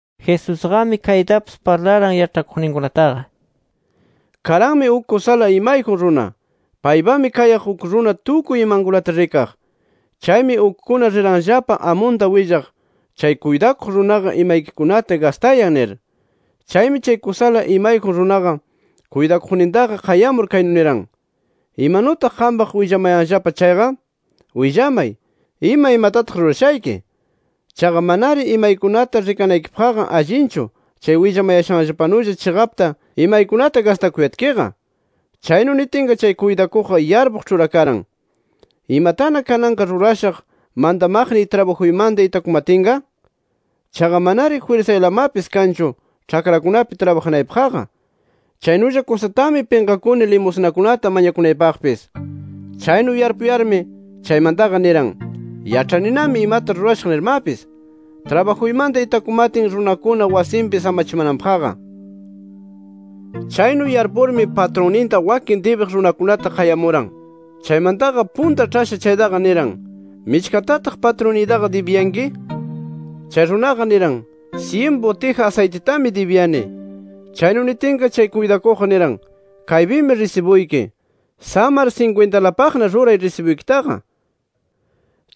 Jesusqami kaytapis parlaran yaĉhakuqninkunataqa: “Karanmi uk kusala imayjun runa. Paypami kayaq uk runa tukuy imankunata rikaq. Chaymi ukkuna riranllapa amunta willaq, chay kuytakuq runaqa, imaykikunata gastayan nir. Chaymi chay kusala imayjun runaqa kuytakuqnintaqa qayamur kaynu niran: ‘¿Imanutaq qampaq willamayanllapa chayqa? Willamay, ima imatataq rurashayki. Chaqa mananari imaykunata rikanaykipaqqa allinchu chay willamashanllapanulla chiqapta imaykunata gastakuyatkiqa’. “Chaynu nitinqa, chay kuytakuqqa yarpuq ĉhurakaran: ¿Imatana kananqa rurashaq mantamaqniy trabajuymanta itakumatinqa? Chaqa manari jwirsaylamapis kanchu ĉhakrakunapi trabajanaypaqqa. Chaynulla kusatami pinqakuni limusnakunata mañakunaypaqpis. Chaynu yarpupakuyarmi chaymantaqa niran: ‘Yaĉhaninami imata rurashaq nirmapis, trabajuymanta itakumatin runakuna wasinpi samachimananpaqqa’. “Chaynu yarpurmi patrunninta wakin dibiq runakunata qayamuran. Chaymantaqa punta ĉhasha chaytaqa niran: ‘¿Michkatataq patrunniytaqa dibiyanki?’. Chay runaqa niran: ‘Syin butija asaytitami dibiyani’. Chaynu nitinqa, chay kuytakuqqa niran: ‘Kaypimi risibuyki. Samar sinkwintalapaqna ruray risibuykitaqa’.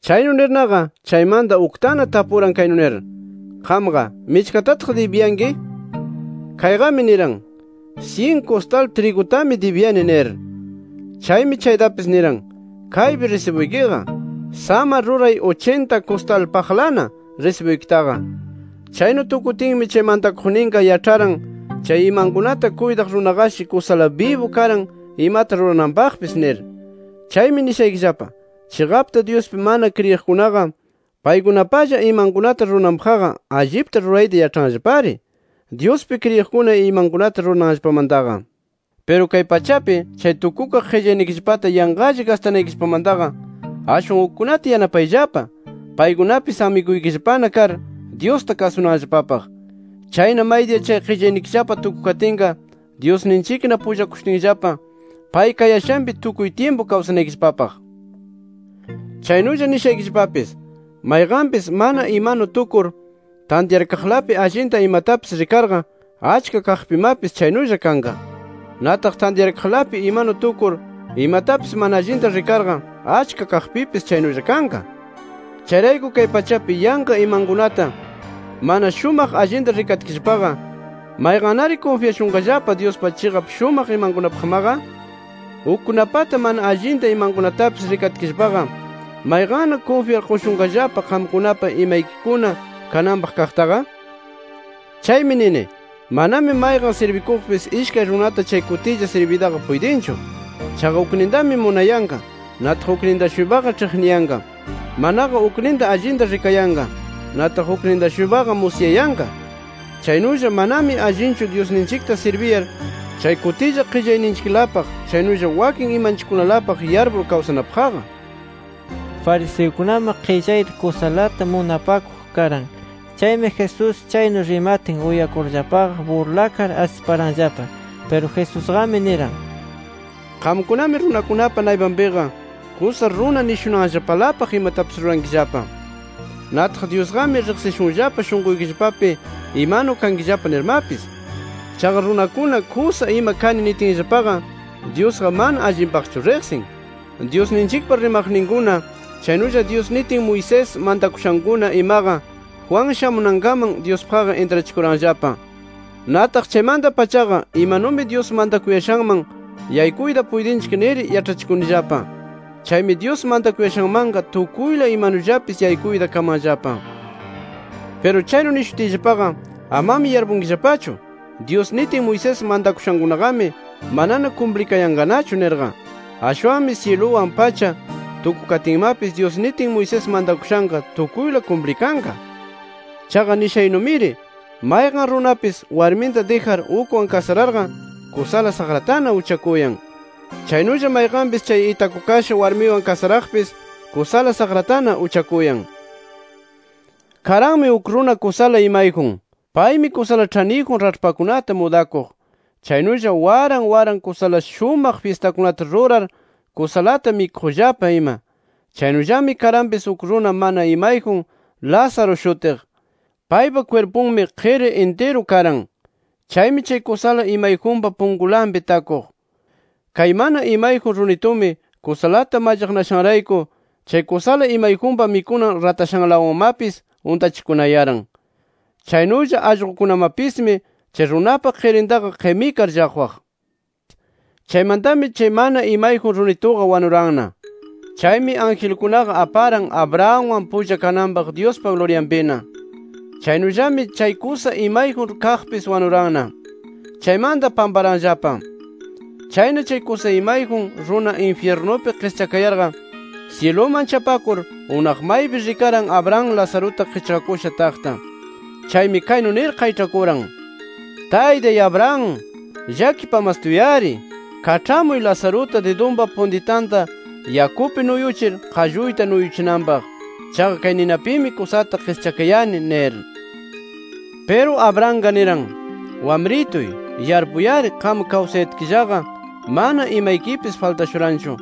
Chaynu nirnaqa chaymanta uktana tapuran kaynu nir: ‘Qamqa, ¿michkatataq dibiyanki?’ Kayqami niran: ‘Syin kustal trigutami dibiyani’ nir. Chaymi chaytapis niran: ‘Kaypi risibuykiqa. Samar ruray uchinta kustalpaqlana risibuykitaqa’. “Chaynu tukutinmi, chay mantakuqninqa yaĉharan chay imankunata kuytaq runaqashi kusala bibu karan imata rurananpaqpis nir. Chaymi nishaykillapa: Chiqapta Dyuspi mana kriyiqkunaqa, paykunapalla imankunata rurananpaqqa allipta rurayta yaĉhanllapari, Dyuspi kriyiqkuna imankunata rurananllapamantaqa. “Piru kay pachapi, chay tukukaq qillaynikillapata yanqalla gastanaykillapamantaqa, ashwan ukkunata yanapayllapa, paykunapis amiguykillapana kar Dyusta kasunanllapapaq. Chayna maydiya chay qillaynikillapa tukukatinqa Dyusninchikna pullakushutinllapa pay kayashanpi, tukuy tyimpu kawsanaykillapapaq. “Chaynulla nishaykillapapis: Mayqanpis mana imanu tukur, tantyarkaqlapi allinta imatapis rikarqa, achka kaqpimapis chaynulla kanqa. Nataq tantyarkaqlapi imanu tukur, imatapis mana allinta rikarqa, achka kaqpipis chaynulla kanqa. Chayrayku kay pachapi yanqa imankunata mana shumaq allinta rikatkillapaqa, ¿mayqannari kunfyashunqallapa Dyuspa chiqap shumaq imankunapaqmaqa? Ukkunapata mana allinta imankunatapis rikatkillapaqa, ¿mayqanna kunfyar qushunqallapa qamkunapa imaykikuna kananpaq kaqtaqa? “Chaymi nini, manami mayqan sirbikuqpis ishkay runata chay kutilla sirbiytaqa puytinchu. Chaqa uknintami munayanqa, nataq ukninta-shuypaqa ĉhiqniyanqa. Manaqa ukninta allinta rikayanqa, nataq ukninta-shuypaqa musyayanqa. Chaynulla manami allinchu Dyusninchikta sirbiyar chay kutilla qillayninchiklapaq chaynulla wakin imanchikkunalapaq yarpur kawsanapaqqa”. Fariseukunami qillayta kusalata munapakuq karan. Chaymi Jesús chaynu rimatin uyakurllapaqa, burlakar asiparanllapa. Piru Jesusqami niran: “Qamkunami runakunapa naypanpiqa kusa runa nishunanllapalapaq imatapis rurankillapa. Nataq Dyusqami riqsishunllapa shunquykillapapi imanu kankillapa nirmapis. Chaqa runakuna kusa ima kani nitinllapaqa, Dyusqa mana allinpaqchu riqsin nir. “Dyusninchikpa rimaqninkuna chaynulla Dyus nitin Moisés mantakushankuna imaqa, Juan shamunankaman Dyuspaqqa intrachikuranllapa. Nataq chaymanta-pachaqa imanumi Dyus mantakuyashanman yaykuyta puytinchik nir yaĉhachikunillapa. Chaymi Dyus mantakuyashanmanqa tukuyla imanullapis yaykuyta kamanllapa. “Piru chaynu nishutiyllapaqa amami yarpunkillapachu, Dyus nitin Moisés mantakushankunaqami manana kumplikayanqanachu nirqa. Ashwanmi syiluwan, pacha tukukatinmapis, Dyus nitin Moisés mantakushanqa tukuyla kumplikanqa. “Chaqa nishaynumiri mayqan runapis warminta dijar ukwan kasararqa, kusala saqratana uchakuyan. Chaynulla mayqanpis chay itakukasha warmiwan kasaraqpis kusala saqratana uchakuyan. “Karanmi uk runa kusala imayjun. Paymi kusala ĉhaniyjun raĉhpakunata mudakuq, chaynulla waran waran kusala shumaq fyistakunata rurar, kusalata mikuqllapa ima. Chaynullami karanpis uk runa mana imayjun Lázaro shutiq. Paypa kwirpunmi qiri intiru karan. Chaymi, chay kusala imayjunpa punkunlapi takuq. Kay mana imayjun runitumi, kusalata mallaqnashanrayku, chay kusala imayjunpa mikunan ratashanlawanmapis untachikunayaran. Chaynulla allqukunamapismi chay runapa qirintaqa qimikar llaqwaq. “Chaymantami chay mana imayjun runituqa wanuranna. Chaymi angelkunaqa aparan Abrahamwan pulla kananpaq Dyuspa luryanpina. Chaynullami chay kusa imayjun kaqpis wanuranna. Chaymanta pamparanllapa. Chayna chay kusa imayjun runa infyirnupi qischakayarqa, syiluman chapakur, unaq maypi rikaran Abraham Lazaruta qichqakusha taqta. Chaymi kaynu nir qayĉhakuran: ‘¡Taytay Abraham, llakipamastuy-ari! Kaĉhamuy Lazaruta didunpa puntitanta yakupi nuyuchir, qalluyta nuyuchinanpaq. Chaqa kay ninapimi kusata qischakayani’ nir. “Piru Abrahamqa niran: ‘Wamrituy yarpuy-ari qam kawsayatkillaqa mana imaykipis faltashuranchu.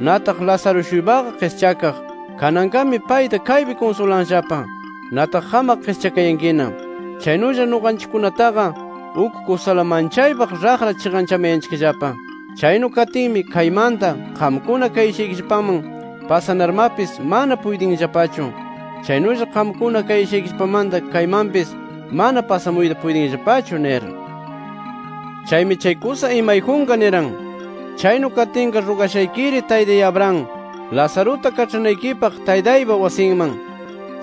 Nataq Lázaro-shuypaqa qischakaq. Kananqami payta kaypi kunsulanllapa. Nataq qamqa qischakayankina. Chaynullami nuqanchikkunataqa uk kusala manchaypaq raqra chiqanchamayanchikllapa. Chaynu katinmi kaymanta, qamkuna kayashaykillapaman pasanarmapis mana puytinllapachu. Chaynulla qamkuna kayashaykillapamanta kaymanpis mana pasamuyta puytinllapachu’ nir. “Chaymi chay kusa imayjunqa niran: ‘Chaynu katinqa rugashaykiri Taytay Abraham, Lazaruta kaĉhanaykipaq taytaypa wasinman.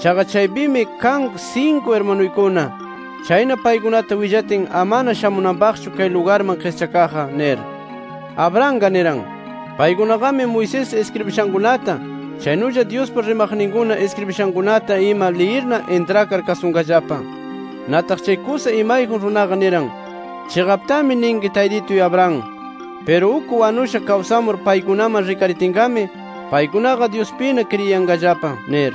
Chaqa chaypimi kan sinku irmanuykuna. Chayna paykunata willatin ama shamunanpaqchu kay lugarman qischakaqqa’ nir. “Abrahamqa niran: ‘Paykunaqami Moisés iskribishankunata, chaynulla Dyuspa rimaqninkuna iskribishankunata ima liyirna intrakar kasunqallapa’. “Nataq chay kusa imayjun runaqa niran: ‘Chiqaptami ninki Taytituy Abraham. Piru uk wanusha kawsamur, paykunaman rikaritinqami paykunaqa Dyuspina kriyiyanqallapa’ nir.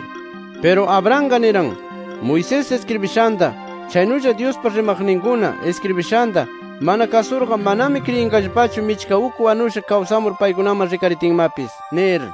“Piru Abrahamqa niran: ‘Moisés iskribishanta, chaynulla Dyuspa rimaqninkuna iskribishanta mana kasurqa, manami kriyinqallapachu michka uk wanusha kawsamur paykunaman rikaritinmapis’ nir”.